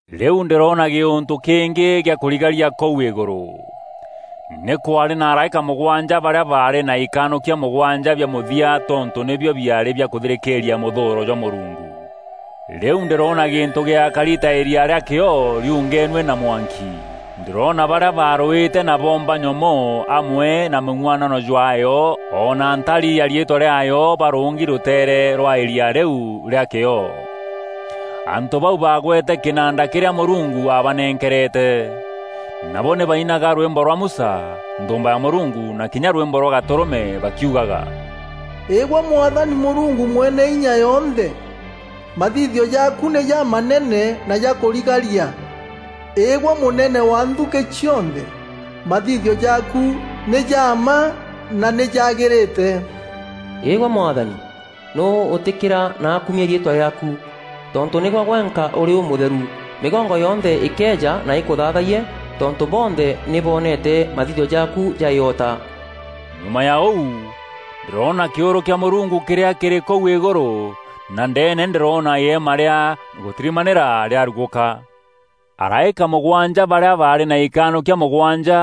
Rîu ndîroona gîûntû kîngî gîa kûrigaria kûu îgûrû. Nî kwaarî na araîka mûgwanja barîa baarî na ikanûkia mûgwanja bia mûthia tontû nîbio biaarî bia kûthirîkîîria mûthûûro jwa Mûrungu. Rîu ndîroona gîntû gîakari ta îria rîa kîoo riungenue na mwanki. Ndîroona barîa baarûîte na boomba nyomoo amwe na mûng'uanano jwaayo o na ntari ya riîtwa rîaayo barûngi rûteere rwa îria rîu rîa kîoo. Antû bau baagwete kînanda kîrîa Mûrungu aabanenkerete. Nabo nî bainaga rwîmbo rwa Musa, nthûûmba ya Mûrungu, na kinya rwîmbo rwa Gatûrûme bakiugaga, “Îgwe Mwathani Mûrungu Mweneinya yonthe, mathithio jaaku nî jamanene na ja kûrigaria! Îgwe mûnene wa nthukî cionthe! Mathithio jaaku nî ja mma na nî jaagîrîte, Îgwe Mwathani, nûû ûtîkîra na akumia riîtwa rîaaku? Tontû nîgwe gwenka ûrî ûmûtheru. Mîgongo yonthe îkeeja na îkûthaathayie, tontû bonthe nî boonete mathithio jaaku ja îota.” Nyuma ya ûu, ndîroona kîûrû kîa Mûrungu kîrîa kîrî kûu îgûrû na ndeene ndîroona îema rîa gûtirimanîra rîarugûka. Araîka mûgwanja barîa baarî na ikanûkia mûgwanja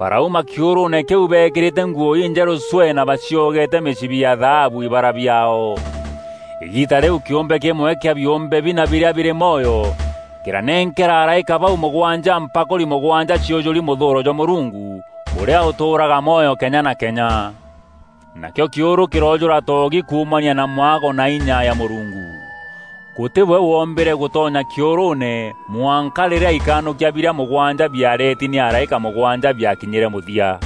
barauma kîûrûûne kîu bekîrîte nguû injerû cwee na baciogeete mîcibi ya thaabu ibara biaao. Îgiita rîu kîumbe kîmwe kîa biûmbe bina birîa birî mwoyo kîranenkera araîka bau mûgwanja mpakûri mûgwanja ciûjûri mûthûûro jwa Mûrungu ûrîa ûtûûraga mwoyo kenya na kenya. Nakîo kîûrû kîroojûra toogi kuumania na mwago na inya ya Mûrungu. Gûtî we wombîre gûtonya kîûrûûne mwanka rîrîa ikanûkia birîa mûgwanja biareti nî araîka mûgwanja biakinyîre mûthia.